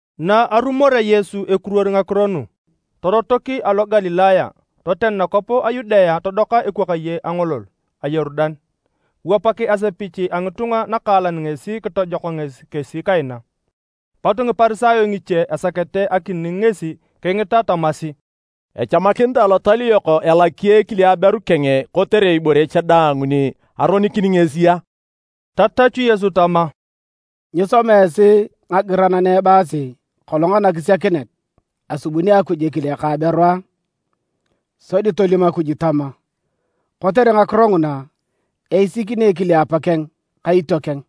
Na arumorea Yesu ekiruor ngakiro nu, torotok alo Galilaya, toten nakwap a Yudea todoka ekwakaye a angolol a Yorudan. Kiwapak asepich a ngitunga nakaalan ngesi kitojok ngesi kesi kaina. Pot Ngiparisayo ngiche esakete akining ngesi kingita tamasi, “Echamakinitae alotal yok elaki ekile aberu keng kotere ibore cha daang ni aronikini ngesi a?” Tatachu Yesu tama, “Nyisoma esi ngagiran na ebaasi, kolong anakisiakinet, asubuni Akuj ekile ka aberu a? Sodi tolim Akuj tama, ‘Kotere ngakiro nguna, eisikini ekile apakeng ka itiokeng,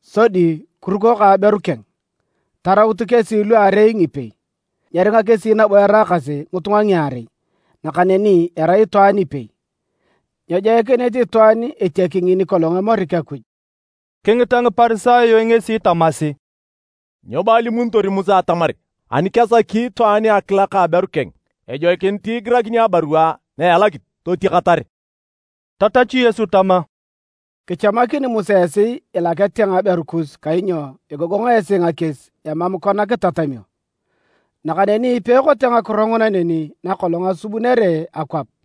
sodi kiruko ka aberu keng, tarautu kesi luarei ngipei’. Nakaneni nyeringa kesi nabo eraakasi ngitunga ngiarei, nakaneni erai itwaan ipei. Nyejoikinit itwaan etiaki ngini kolong emorik Akuj.” Kingita Ngiparisayo ngesi tamasi, “Nyo bo alimunitor Musa atamar ani kesaki itwaan akilak aberu keng ejoikinit igirakini abarua na elakit, totiakatar.” Tatachu Yesu tama, “Kichamakini Musa esi ilakete ngaberu kus kainyo egogong esi ngakies emam kona kitatamio. Nakaneni peekote ngakiro nguna neni nakolong asubunere akwap.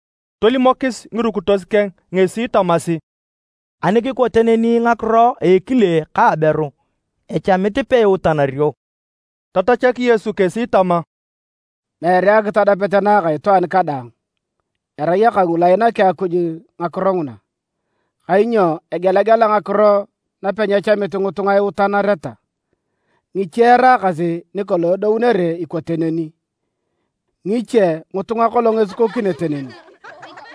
Tolimokis ngirukitos keng ngesi tamasi, “Ani kikote neni ngakiro a ekile ka aberu echamit peiutanario.” Tatachak Yesu kesi tama, “Meere akitadapet na aka itwaan kadaang. Erai aka ngulu ainaki Akuj ngakiro nguna. Kainyo egelagela ngakiro napenyechamit ngitunga iutanareta. Ngiche eraakasi ni kolong edounere ikote neni. Ngiche ngitunga kolong esikokinete neni.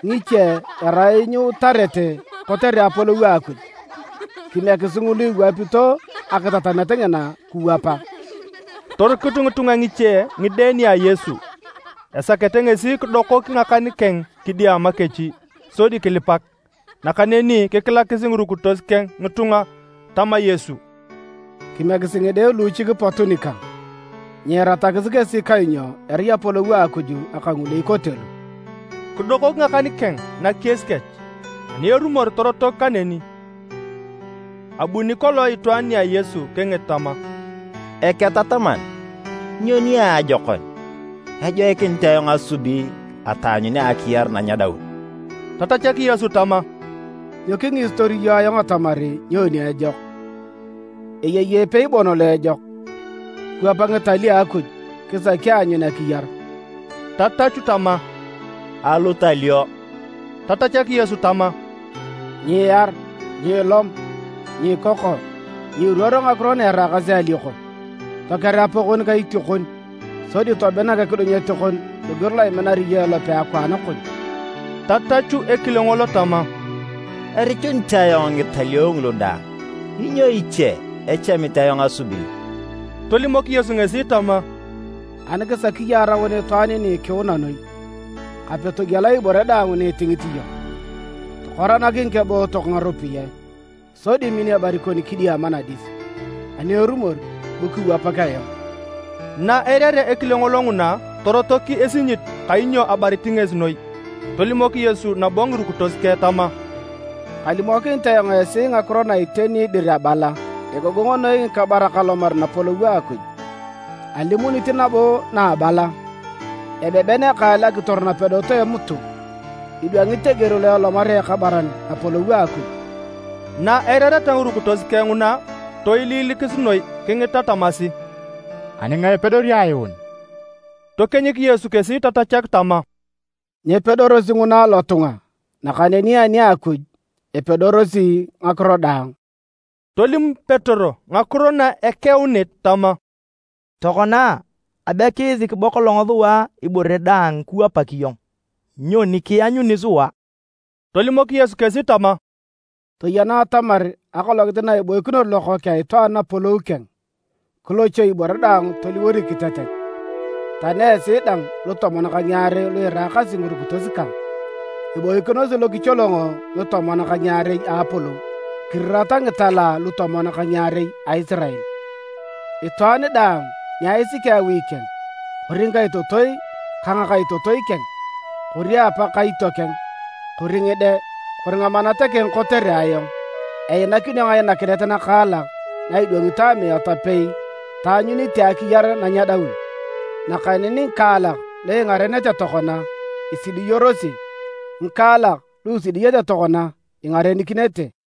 Ngiche erai nyiutarete kotere Apolou a Akuj. Kimiekisi ngulu iwapito akitatamet ngina kiwapa.” Torikut ngitunga ngiche ngide nia Yesu esakete ngesi kidokok ngakan keng kidiama kech sodi kilipak. Nakaneni kikilakis ngirukitos keng ngitunga. Tama Yesu, “Kimiekisi ngide luuchik pot nikang. Nyiiratakis kesi kainyo erai Apolou a Akuj aka ngulu ikote lu.” Kidokok ngakan keng nakies kech, ani erumor torotok kaneni. Abuni kolong itwaan nia Yesu kingit tama, “Eketataman, nyo niajokon ejoikinit ayong asubi ataanyunea akiyar na nyedaun?” Tatachak Yesu tama, “Nyo kingisitor iyong ayong atamar nyoni ejok? Eyei epei bon lo ejok. Kiwap ngitalio a Akuj kisaki aanyun akiyar.” Tatachu tama, “Alutalio?” Tatachak Yesu tama, “Nyiiar, nyiilom, nyiikoko, nyiiruor ngakiro na eraakasi alioko. Toker apakon ka itiokon, sodi tominak ekidunyet kon loger lo iminar iyong elope akwaan kon.” Tatachu ekile ngolo tama, “Erichunit ayong ngitalio ngulu daang. Nyo iche echamit ayong asubi?” Tolimok Yesu ngesi tama, “Ani kisaki iyong araun itwaan ni ikiuna noi, kape togiela ibore daang ni itingit iyong, tokoranak ngikebootok ngaropiyae, sodi min ebari kon kidiama nadis. Ani erumor bu kiwapak ayong.” Na eirarea ekile ngolo nguna, torotok esinyit kainyo abarit ngesi noi. Tolimok Yesu nabo ngirukitos keng tama, “Kalimokinit ayong esi ngakiro na iteni dir abala: egogong noi ngikabarak alomar Napolou a Akuj. Alimunit nabo na abala, ebeben ekaal akitor napedot a emutu idwangit eger lo elomarea ekabaran Napolou a Akuj.” Na eirareta ngirukitos keng nguna, toiliilikis noi kingita tamasi, “Ani ngae epedori ayuun?” Tokienyik Yesu kesi tatachak tama, “Nyepedorosi nguna alotunga, nakaneni ani a Akuj, epedorosi ngakiro daang.” Tolim Petero ngakiro na ekeunit tama, “Tokona abe kiisik bo kolong sua ibore daang kiwapak iyong. Nyoni kianyuni sua?” Tolimok Yesu kesi tama, “Toyena atamar akolongit na iboikinor Lokookeng a Itwaan Napolou keng, kilochoi ibore daang toliwor ikitetet, tani esi dang lutomon ka ngiarei lu iraakasi ngirukitos kang, iboikinosi lokicholongo ngitomon ka ngiarei a Napolou, kirirata ngitela lutomon ka ngiarei a Isirael. Itwaan daang ni aisiki awi keng, kori ngikaitotoi ka ngakaitotoi keng, kori apa ka itiokeng, kori ngide, kori ngamanat keng kotere ayong, einakinio ngainakinet nakaalak na idwangito amiat apei taanyunite akiyar na nyedaun. Nakaneni ngikaalak lu ingarenete tokona, isidiyorosi, ngikaalak lu isidiyete tokona, ingarenikinete.